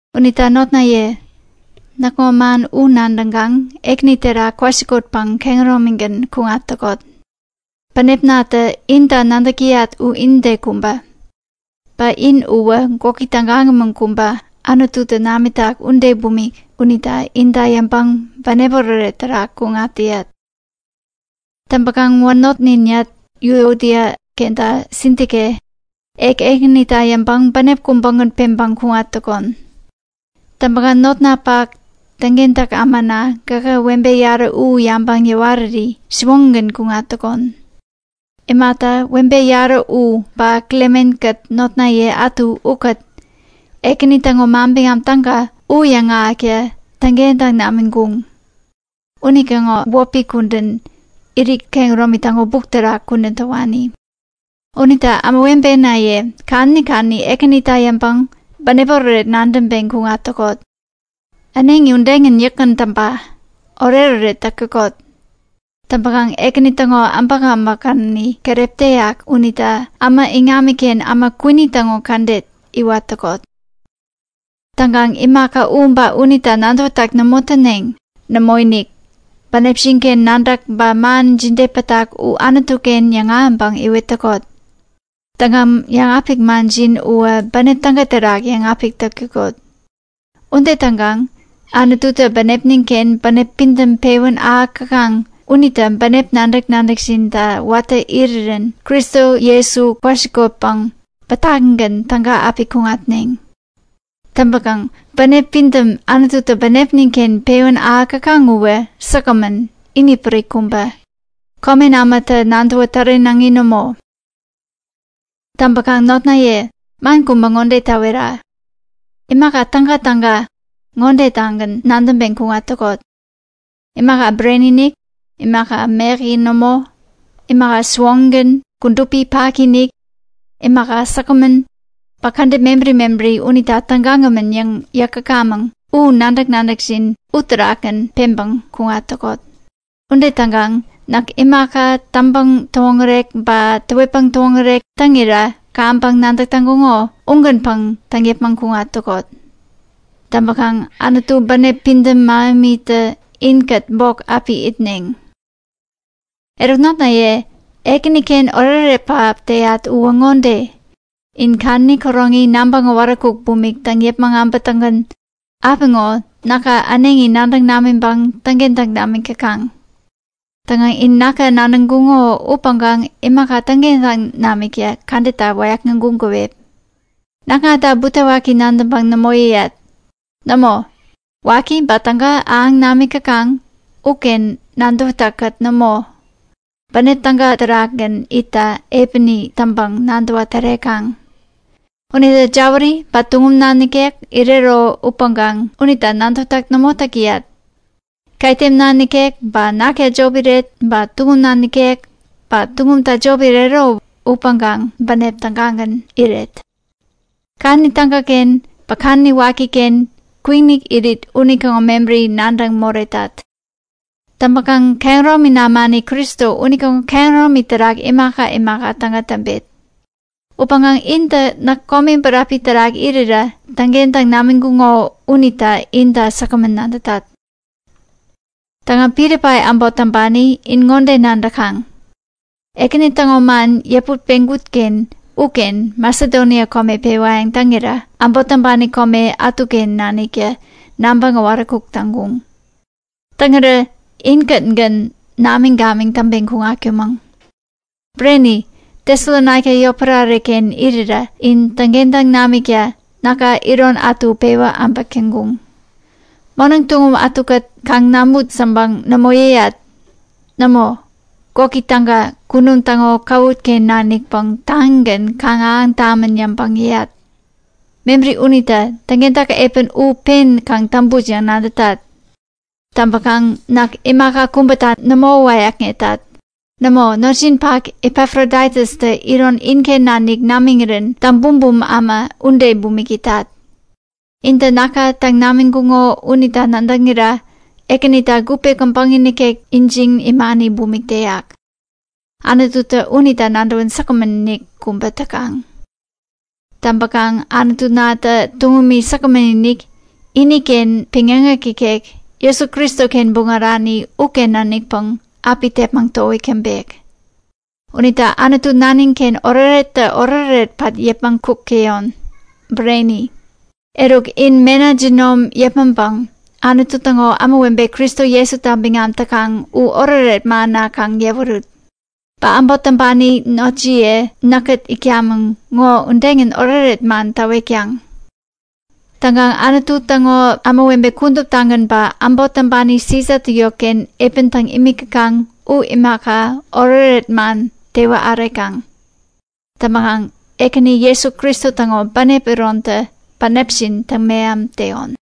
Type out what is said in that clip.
Unita notnaye, näkŋo man u nadäŋkaŋ Ekäni terak kwasikotpäŋ kehäromigän kuŋat täkot. Bänepnatä inta nadäk täyat u inide kubä. Ba in uwä gwäki tägagämän kubä Anututä namitak ude bumik unita inta yäŋpäŋ bänep oretoret terak kuŋat täyat. Täŋpäkaŋ wanotninyat Yuodia kenta Sintike, ek Ekänita yäŋpäŋ bänep kubägän peŋpäŋ kuŋat täkon. Täŋpäkaŋ notnapak täŋkentäk ämana, gähä webe yarä u yabäŋ yäwariri siwoŋigän kuŋat täkon. Imata, webe yarä u ba Klemen-kät notnaye ätu ukät Ekäni täŋo Manbiŋam Täga u yäŋahäkta täŋkentäŋ namiŋkuŋ. Unitäŋo wäpi kudän, irit kehäromi täŋo buk terak kudän täwani. Unita ämawebenaye, kadäni kadäni Ekänita yäŋpäŋ bänep oretoret nadäŋpeŋ kuŋat täkot. Äneŋi udegän yäkgän täŋpa; Oretoret täk täkot! Täŋpäkaŋ Ekäni täŋo äbäkäbäk kadäni keräp täyak unita äma iŋamiken äma kwini täŋo kädet iwat täkot. Täŋkaŋ imaka u ba unita nadäwätäk nämo täneŋ. Nämoinik, bänepjin-ken nadäk ba man jide pätak u Anutu-ken yäŋahäŋpäŋ iwet täkot. Täŋkaŋ yäŋapik manjin uwä bänep täga terak yäŋapik täkot. Ude täŋkaŋ Anututä bänepnin-ken bänep pidäm pewän ahäk täkaŋ unitä bänep nadäk-nadäkjinta watä irirän Kristo Jesu kwasikotpäŋ bätakigän täga api kuŋatneŋ. Bänep pidäm Anututä bänepnin-ken pewän ahäk täkaŋ uwä säkgämän, inipärik kubä, komen ämatä nadäwä tärenaŋi nämo. Täŋpäkaŋ notnaye, man kubä ŋode täwetat; Imaka tägatäga ŋodetagän nadäŋpeŋ kuŋat täkot; Imaka bureni-inik, imaka mäyäki nämo, imaka siwoŋigän kudupi paki-inik, imaka säkgämän, ba kädet mebäri mebäri unita tägagämän yäŋ yäk täkamäŋ. Nadäk-nadäkjin imaka udewani terakgän peŋpäŋ kuŋat täkot. Ude täŋkaŋ näk imaka täŋpäŋ-täwoŋärek ba täwetpäŋ täwoŋärek täŋira kaŋpäŋ nadäk täŋkuŋo ugänpäŋ täŋ yäpmäŋ kuŋat täkot. Täŋpäkaŋ Anutu bänep pidäm mähemitä inkät bok api itneŋ. Eruk notnaye Ekänita oretoret pähap täyat uwä ŋode; In kadäni käroŋi nabäŋ äwaräkuk bumik täŋ yäpmäŋ äbätäŋgän apiŋo näka äneŋi nadäŋ namiŋpäŋ täŋkentäŋ namik täkaŋ. Täŋkaŋ in näka nadäŋkuŋo upäŋkaŋ imaka täŋkentäŋ namikta kädetta wäyäkŋeŋkuŋ käwep. Näkŋata butewaki nadäŋpäŋ nämo yäyat. Nämo, waki ba täga ahäŋ namik täkaŋ uken nadäwätäk-kät nämo, bänep täga terakgän itta epäni täŋpäŋ nadäwa tärekaŋ. Unita jäwäri ba tuŋumna nikek irero upäŋkaŋ unita nadäwätäk nämo täk täyat. Ketemna nikek ba nakta jop iret, ba tuŋumna nikek ba tuŋumta jop irero upäŋkaŋ bänep tägagän nadäŋpäŋ iret. Kadäni tägaken ba kadäni wakiken kwikinik irit unitäŋo mebäri nadäŋ moretat. U imata? Kehäromi namani Kristo unitäŋo kehäromi terak imaka imaka täga täŋpet. Upäŋkaŋ intä näk komi bäräpi terak irira täŋkentäŋ namiŋkuŋo unita inta säkgämän nadätat. Täŋkaŋ Pilipai äbot täŋpani in ŋode nadäk täkaŋ; Ekäni täŋo man yäput peŋkut-ken uken Masedonia kome pewayäŋ täŋira äbot täŋpani kome ätuken naniktä nabäŋ äwaräkuk täŋkuŋ. Täŋirä inkätgän namiŋ-gamiŋ täŋpeŋ kuŋatkumäŋ. Bureni, Tesalonaika yotpärare-ken irira in täŋkentäŋ namikta näka iron ätu pewä äbäk täŋkuŋ. Moneŋ tuŋum ätukät kaŋ namut yäŋpäŋ nämo yäyat. Nämo, gwäki täga kunum täŋo käwut-ken nanikpäŋ taŋigän kaŋ ahäŋ tamän yäŋpäŋ yäyat. Mebäri unita täŋkentäk epän u pen kaŋ täŋput yäŋ nadätat. Täŋpäkaŋ näk imaka kubäta nämo wäyäkŋetat. Nämo, notjinpak Epafroditustä iron inken nanik namiŋirän täŋbumbum äma ude bumik itat. Intä näka täŋ namiŋkuŋo unita nadäŋira Ekänita gupe käbäŋi nikek ijiŋ imani bumik täyak. Anututä unita nadäwän säkgämän-inik kubä täkaŋ. Täŋpäkaŋ Anutunatä tuŋumi säkgämän-inik, iniken peŋyäŋek ikek, Jesu Kristoken buŋärani uken nanikpäŋ api tepmäŋ towik täŋpek. Unita Anutu nanin-ken oretorettä oretoret pat yäpmäŋ kuk täyon. Bureni! Eruk, in mena jinom yäpmäŋpäŋ Anutu täŋo kudupi ämawebe Kristo Jesuta biŋam täkaŋ u oretoret manna kaŋ yäwerut. Ba äbot täŋpani notjiye näkkät itkamäŋ ŋo udegän oretoret man täwetkaŋ. Täŋkaŋ Anutu täŋo kudupi ämawebe kuduptagän ba äbot täŋpani Sisatä yotken epän täŋ imik täkaŋ u imaka, oretoret man tewä ärekaŋ. Täŋpäkaŋ Ekäni Jesu Kristo täŋo bänep irontä bänepjin täŋ-meham täyon.